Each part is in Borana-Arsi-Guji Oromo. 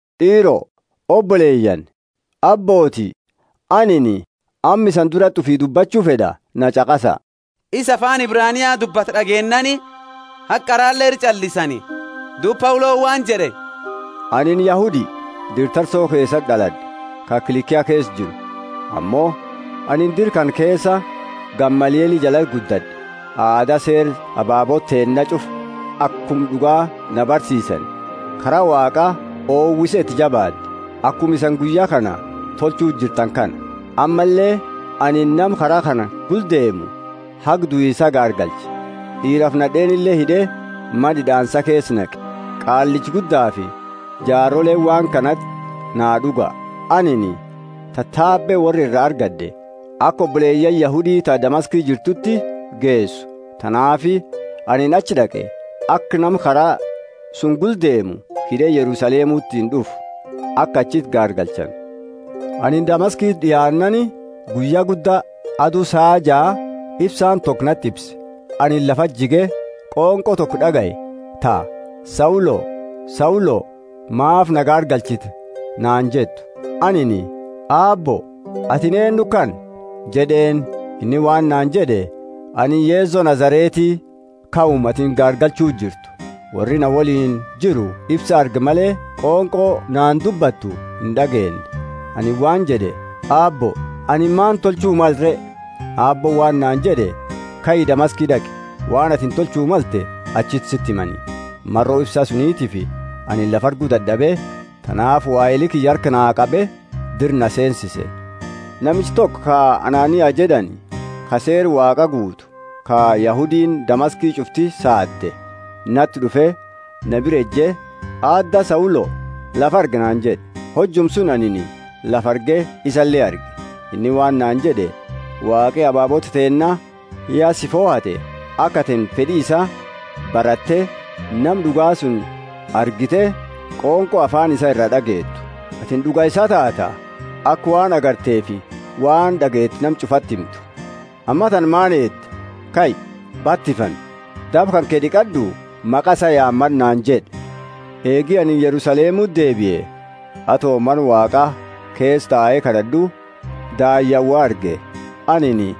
D'iiro, oboleyaani, abbooti, anini amma isani durati ufii dubbachu fed'a na ch'aqasa! Isa afaani Ebrania dubbatu d'ageennaani haga qarale ira ch'allisani. Duuba Pauloni waan jed'e. Anini Yahudi, dira Tarso keesati d'alad'e, ka Kilikia keesa jiru, ammo anini dira kana keesa Gamalieli jalati guddad'e. Aada Seera ababoota teenna ch'ufa akuma d'ugaa na barsiisani kara Waaqaa owise iti jabaad'e, akuma isani guyya kana tolchuuti jirtani kana. Ammalle anini nama Kara kana gula deemu haga duisa gaargalche, d'iirafi nad'eenile hid'e, mana hid'aansa keesa naqe. Qaallicha Guddafi jaaroleeni waan kanati naa d'uga. Anini tatabe worra ira argad'e, aka oboleyaani Yahudi ta Damaski jirtuti geesu; tanaafi anini achi d'aqe, aka nama Kara suni gula deemu hid'e Yerusalemutini d'ufu, aka achiti gaargalchani. Anini Damaskiti d'iaannaani, guyya gudda, adu saa jaa, ifsaani toko nati ifse. Anini lafati jige, qonqo toko d'agaye ta, Saulo, Saulo, maafi naa gaargalchita? naani jettu. Anini, Aabbo, atini eennu kana? jed'eeni. Inni waan naani jed'e, Anini Yeso Nazareti, kauma atini gaargalchuu jirtu. Worri na woliini jiru ifsa arge male, qonqo naani dubbattu ind'ageenne. Anini waan jed'e, Aabbo, anini maani tolchu male re? Aabbooni waan naani jed'e, Kai, Damaski d'aqi, waan atini tolchu malte achiti siti himani. Maro ifsa sunitiifi anini lafa argu dad'abe; tanaafi waheli kiyya harka naa qabe dira na seensise. Namichi toko, ka Anania jed'ani, ka Seera Waaqa guutu, ka Yahudiini Damaski ch'ufti saade, nati d'ufe na bira eje, Aadda Saulo, lafa argi naani jed'e. Hojuma suni anini lafa arge isale arge. Inni waan naani jed'e, Waaqi ababoota teenna ya si fohate, aka atini fed'i isaa baratte Nama d'uga suni argite qonqo afaani isaa iraa d'ageetu. Atini d'uga isaa taata, aka waan agarteefi waan d'ageete nama ch'ufati himtu. Ammatana maani eedda? Kai, batifami, daba kanke d'iqad'u, maqa isaa yaamad'u naani jed'e. Eegi anini Yerusalemuti deebie, ato Mana Waaqaa keesa tae kad'ad'u, daayyaani wo arge. Anini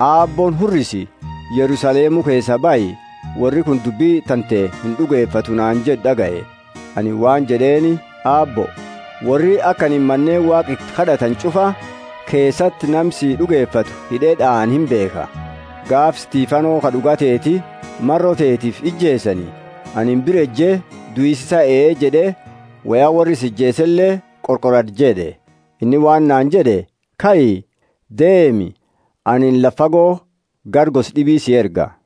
Aabbooni, Hurrisi, Yerusalemu keesaa bahi, worri kuni dubbi tante ind'ugefatu naani jed'u d'agaye. Anini waan jed'eeni, Aabbo, worri aka anini maneeni Waaqa iti kad'atani ch'ufa keesati nama si d'ugefate hid'e d'aane imbeekha. Gaafa Stefano, ka d'uga teeti, maro teetifi ijeesani, anini bira eje duisa isaa ee jed'e woya worra isa ijeesele qorqorad'e jed'e. Inni waan naani jed'e, Kai, deemi, anini lafa fago gara gosa d'ibi si erga.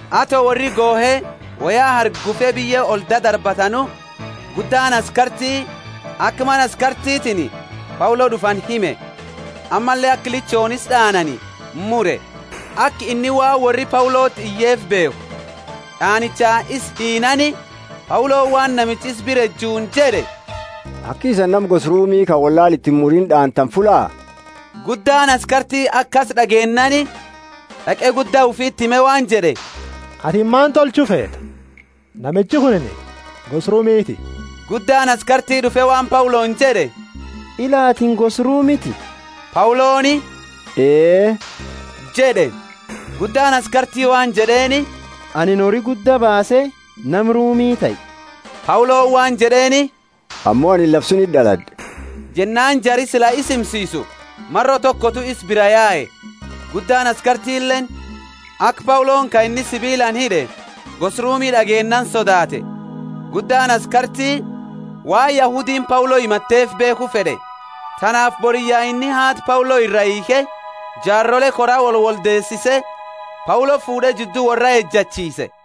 Ato worri gohe woya hargufe biyye oli dadarbatanu, guddaani askarti aka mana askartitiini Paulo d'ufani hime, ammalle aka lichooni isa d'aanani mure, aka inni waan worri Pauloti iyeefi beekhu. D'aanicha isa hiinaani Pauloni, waan namicha isa bira ejuni jed'e, aki isani nama gosa Rumi ka wollaala iti imurini d'aantani fullaa? Guddaani askarti akasi d'ageennaani d'aqe gudda ufiti hime waan jed'e, Atini maani tolchu feeta? Namichi kunini gosa Rumiti. Guddaani askarti d'ufe waan Pauloni jed'e, Ila, atini gosa Rumiti? Pauloni, Ee jed'e. Guddaani askarti waan jed'eeni, Anini hori gudda baase nama Rumi tahe. Pauloni waan jed'eeni, Ammo anini lafa suniti d'alad'e. Jennaani jari sila isa himsisu maro tokotu isa biraa yae. Guddaani askartileeni, aka Pauloni ka inni sibiilaani hid'e gosa Rumi d'ageennaani sodaate. Guddaani askarti waan Yahudiini Paulo himateefi beekhu fed'e, tanaafi boriyya inni haada Paulo iraa hiikhe, jaarole koraa wolwoldeesise, Paulo fuud'e jiddu worra ejachiise.